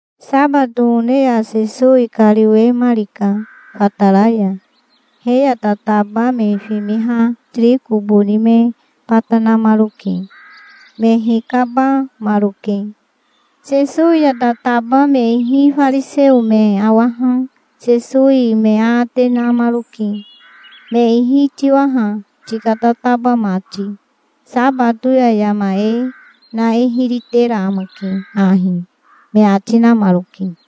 Sabato one ya Sesowi kariwemarika fatara ya. He ya tataba me fimiha tiriko boni me bata namaroke. Me hikabamaroke. Sesowi ya tataba me ihi fariseo me awaha Sesowi me aate namaroke. "Me ihi tiwa ha, tika tataba mati. Sabato ya yama e na e hiri tera amake ahi", me ati namaroke.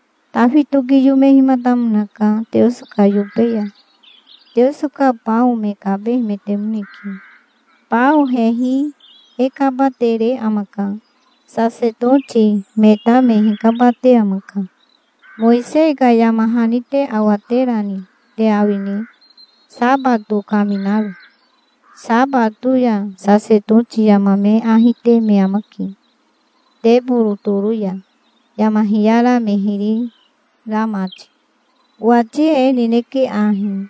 Tafi tokiyomehimatamonaka Teoso ka yobe ya. Teoso ka bao me kabehemetemoneke. Bao hehi e kabatere amaka. Sasetoti me ta me hikabate amaka. Mowisei ka yama hani te awaterani te awine, sabato kaminaro? Sabato ya sasetoti yama me ahi te me amake, teboro toro ya, yama hiyara me hiri ra mati. Owati e nineke ahi: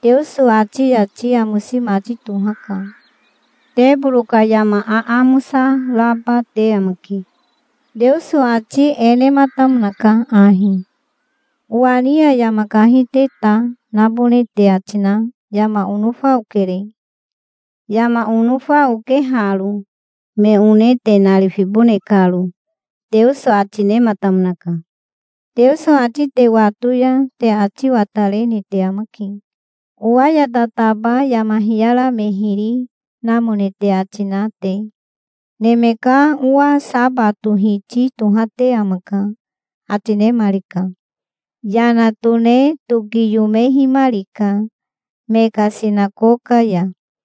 Teoso ati yati amosi mati tohaka. Teboro ka yama aamosa raba te amake. Teoso ati e nematamonaka ahi: 'Owa ni ya yama kahi te ta nabone te ati na yama onofa okere. Yama onofa oke haro, me one te narifibone karo', Teoso ati nematamonaka. Teoso ati te wato ya te ati watarene te amake, owa ya tataba yama hiyara me hiri namone te ati na te. Neme ka Owa sabato Hiti tohate amaka", ati nemarika. Yana tone tokiyomehimarika me ka sinakoka ya.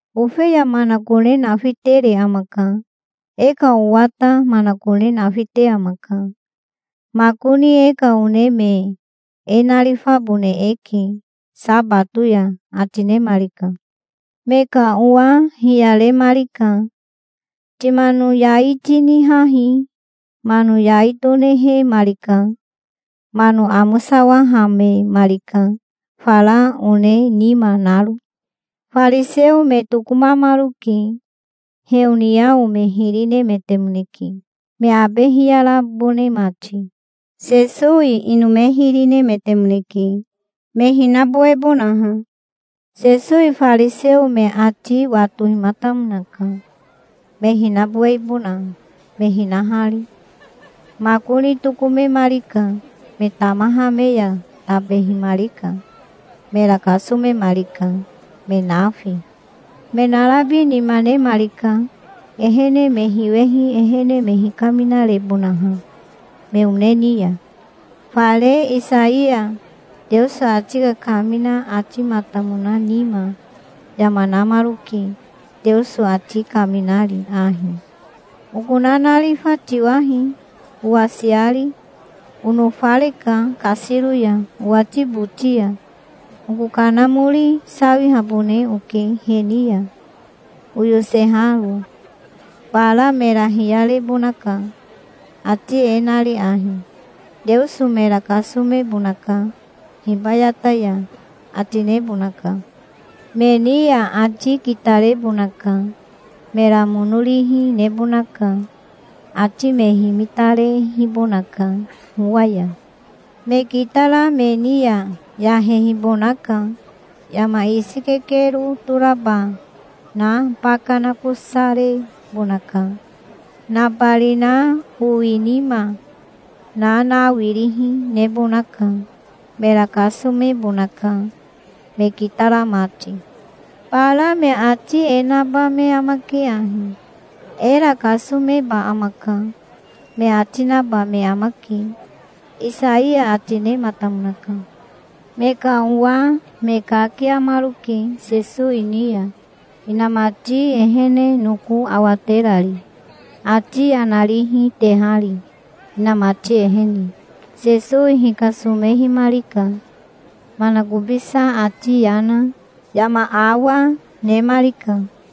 Ofeya manakone nafitere amaka. E ka owa ta manakone nafite amaka. Makoni e ka one me e narifabone eke sabato ya", ati nemarika. Me ka owa hiyaremarika. "Timano yai tinihahi". Mano yai tonihemarika. Mano amosawahamemarika, fara one nima naro. Fariseo me tokomamaroke. Heoniao me hiri nemetemoneke, me abe hiyarabone mati. Sesowi ino me hiri nemetemoneke, me hinabowebonaha. Sesowi fariseo me ati watohimatamonaka, me hinabowehibona me hinahari. Makoni tokomemarika. Me tamaha me ya tabehimarika. Mera kasomemarika, me nafi. Me narabi nima nemarika, ehene me hiwehi ehene me hikaminarebonaha me one ni ya. Fare Isaiya Teoso ati kakamina atimatamona nima yama namaroke, Teoso ati kaminari ahi: "Oko nanarifa tiwahi, owasiari. Onofareka kasiro ya owati boti ya. Oko Kanamori sawihabone oke he ni ya oyoseharo. Bara mera hiyarebonaka, ati e nari ahi: 'Teoso mera kasomebonaka hibayata ya', ati nebonaka. Me ni ya ati kitarebonaka. Mera mono rihi nebonaka. Ati me himitarehibonaka howa ya. Me kitara me ni ya yahehibonaka. Yama isi kekero toraba na baka nakosarebonaka. Nabarina owinima na nawirihi nebonaka. Mera kasomebonaka, me kitara mati. Bara me ati e naba me amake ahi: 'Era kasomeba amaka', me ati naba me amake, Isaiya ati nematamonaka. Me ka owa me kakiamaroke Sesowi ni ya, inamati ehene noko awaterari, ati yana rihi tehari, inamati ehene. Sesowi hikasomehimarika. Manakobisa ati yana, yama awa, nemarika.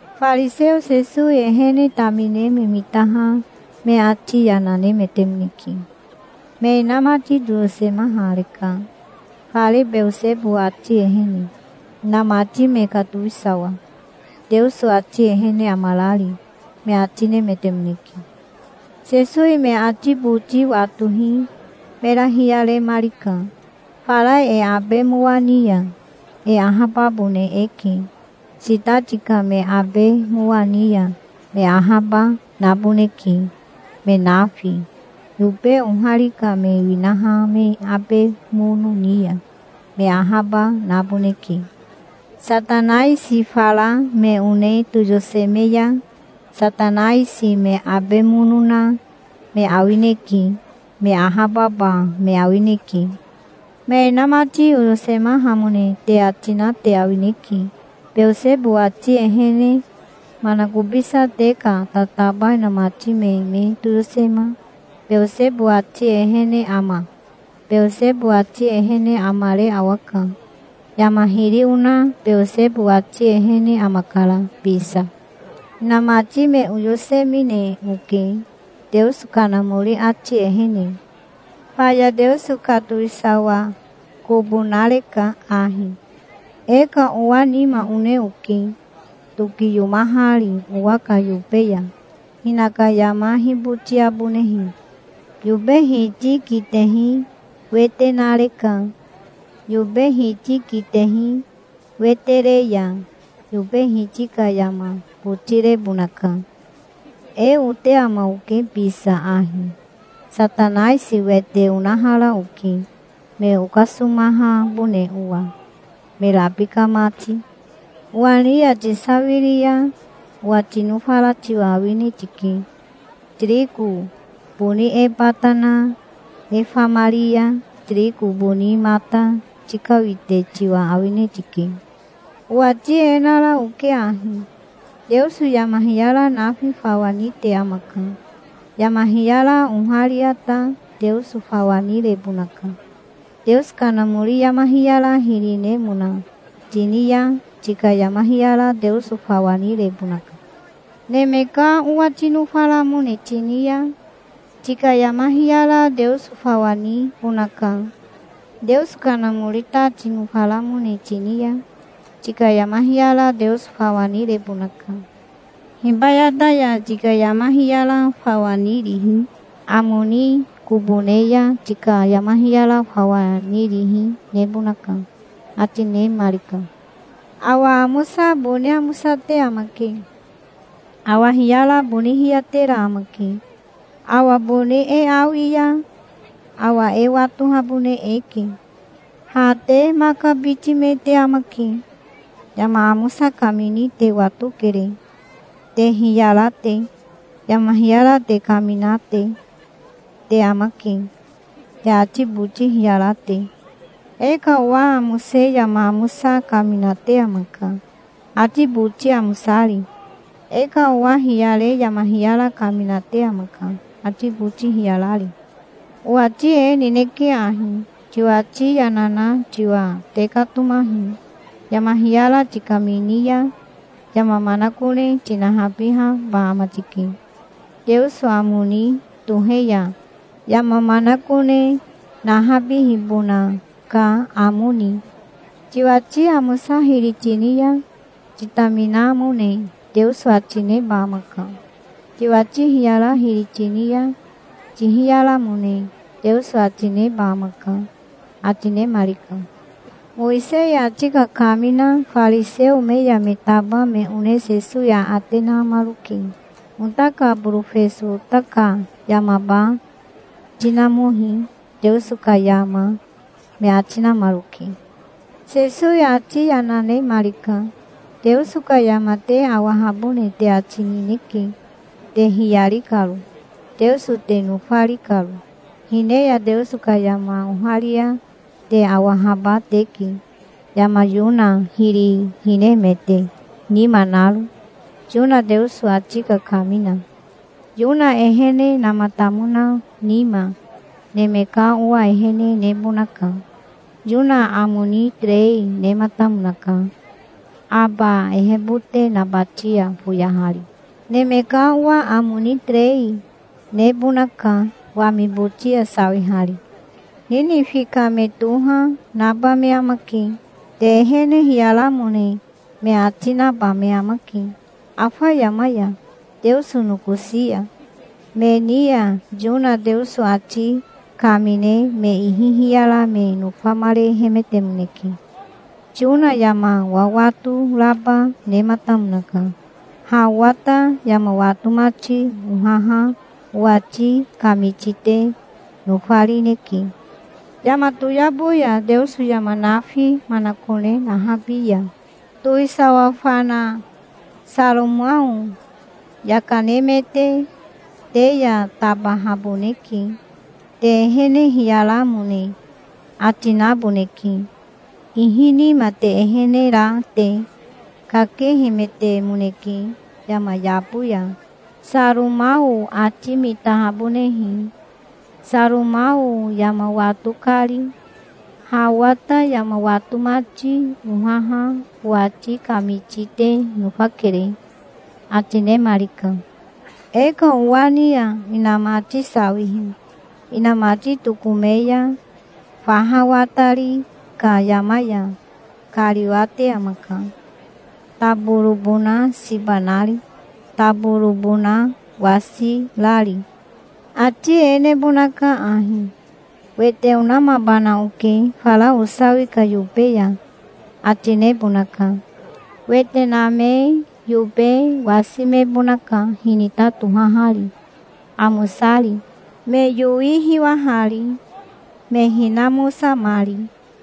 Fariseo Sesowi ehene tamine me mitaha me ati yana nemetemoneke. "Me inamati toyosemahareka, fare Beosebo ati ehene, inamati me ka towisawa, Teoso ati ehene amarari", me ati nemetemoneke. Sesowi me ati boti watohi mera hiyaremarika. "Fara e abe mowa ni ya e ahababone eke. Sitati ka me abe mowa ni ya me ahaba naboneke, me nafi. Yobe ohari ka me winaha me abe mono ni ya, me ahaba naboneke. Satanaisi fara me one toyoseme ya, Satanaisi me abe mono na me awineke. Me ahababa me awineke. Me inamati oyosemahamone te ati na te awineke, Beosebo ati ehene. Manakobisa te ka tataba inamati me me toyosema Beosebo ati ehene ama? Beosebo ati ehene amare awaka. Yama hiri ona Beosebo ati ehene amakara bisa. Hinamati me oyosemine oke Teoso Kanamori ati ehene. Faya Teoso ka towisawa kobo nareka ahi. E ka owa nima one oke, tokiyomahari owa ka yobe ya, hinaka yama hibotiabonehe. Yobe hiti kitehi wete nareka. Yobe hiti kitehi wete re ya yobe hiti ka yama botirebonaka. E ote ama oke bisa ahi. Satanaisi wete onahara oke, me okasomahabone owa, me rabika mati. Owa ni ya tisawiri ya owa tinofara tiwa awine tike. Tiriko boni e bata na e famari ya tiriko boni mata tikawite tiwa awine tike. Owati e nara oke ahi: Teoso yama hiyara nafi fawa nite amaka. Yama hiyara oharia ta Teoso fawa nirebonaka. Teoso Kanamori yama hiyara hiri nemona tini ya tika yama hiyara Teoso fawa nirebonaka. Neme ka Owa tinofaramone tini ya tika yama hiyara Teoso fawa nibonaka. Teoso Kanamori ta tinofaramone tini ya tika yama hiyara Teoso fawa nirebonaka. Hibayata ya tika yama hiyara fawa nirihi, amo ni kobo ne ya tika yama hiyara fawa nirihi nebonaka", ati nemarika. "Awa amosa boni amosate amake. Awa hiyara boni hiyatera amake. Awa boni e awi ya awa e watohabone eke. Ha te maka biti me te amake. Yama amosa kamini te watokere, te hiyara te. Yama hiyara te kaminate te amake, te ati boti hiyara te. E ka owa amose yama amosa kaminate amaka, ati boti amosari. E ka owa hiyare yama hiyara kaminate amaka, ati boti hiyarari. Owati e nineke ahi: Tiwati yana na tiwa tekatomahi. Yama hiyara tikamini ya yama manakone tinahabihaba ama tike, Teoso amo ni tohe ya, yama manakone nahabihibona ka amo ni. Tiwati amosa hiri tini ya titaminamone Teoso ati neba amaka. Tiwati hiyara hiri tini ya tihiyaramone Teoso ati neba amaka", ati nemarika. Mowisei ati kakamina fariseo me ya me taba me one Sesowi aate namaroke. "Ota ka borofeso ota ka yamaba tinamohi Teoso ka yama", me ati namaroke. Sesowi ati yana nemarika. "Teoso ka yama te awahabone te ati nineke, te hiyari karo, Teoso te nofari karo. Hine ya Teoso ka yama oharia te awahaba teke, yama Yona hiri hinemete nima naro, Yona Teoso ati kakamina. Yona ehenematamona nima Neme ka Owa ehene nebonaka. Yona amo ni terei nematamonaka aba ehebote nabati ya foyahari. Neme ka Owa amo ni terei nebonaka wami boti ya sawihari. Ninifi ka me toha, naba me amake. Te ehene hiyaramone me ati, naba me amake afa yama ya, Teoso nokosi ya. Me ni ya Yona Teoso ati kamine me ihi hiyara me nofamarehemetemoneke. Yona yama wawato raba nematamonaka. Ha owa ta yama wato mati ohaha owati kamiti te nofarineke. Yama toyabo ya Teoso yama nafi manakone nahabi ya towisawa fana Saromao yaka nemete te ya tabahaboneke. Te ehene hiyaramone ati naboneke, ihi nima te ehene ra te. Kakehemetemoneke yama yabo ya Saromao ati mitahabonehe Saromao yama wato kari. Ha owa ta yama wato mati ohaha owati kamiti te nofakere", ati nemarika. "E ka owa ni ya inamati sawihi inamati tokome ya faha watari ka yama ya kariwate amaka, taborobona siba nari, taborobona wasirari. Ati e nebonaka ahi: 'Wete onamabana oke fara osawi ka yobe ya', ati nebonaka. Wete name yobe wasimebonaka, hinita tohahari, amosari, me yowi hiwahari, me hinamosamari.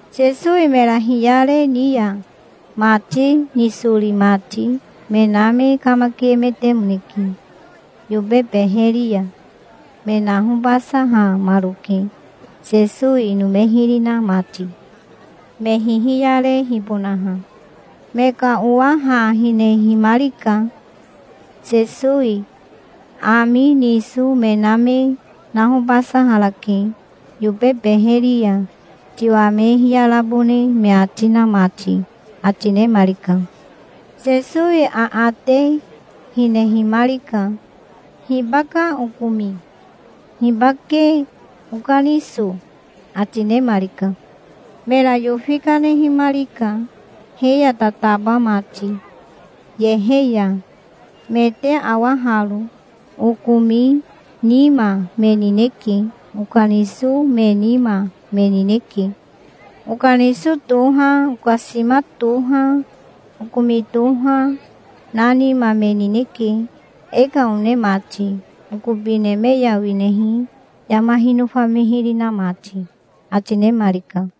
Sesowi mera hiyare ni ya mati nisori mati me na me kamakiemetemoneke. Yobe beheri ya me nahobasahamaroke, Sesowi ino me hiri na mati, me hihiyarehibonaha. Me ka owa ha hinehimarika. "Sesowi ami niso me na me nahobasaharake yobe beheri ya, tiwa me hiyarabone me ati na mati", ati nemarika. Sesowi aate hinehimarika. "Hibaka okomi? Hibake okaniso?" ati nemarika. Mera yofi kanehimarika he ya tataba mati yehe ya. "Me te awa haro. Okomi nima me nineke. Okaniso me nima, me nineke. Okaniso toha, okasima toha, okomi toha, na nima me nineke, e ka one mati, okobi neme ya winehi yama hinofa me hiri na mati", ati nemarika.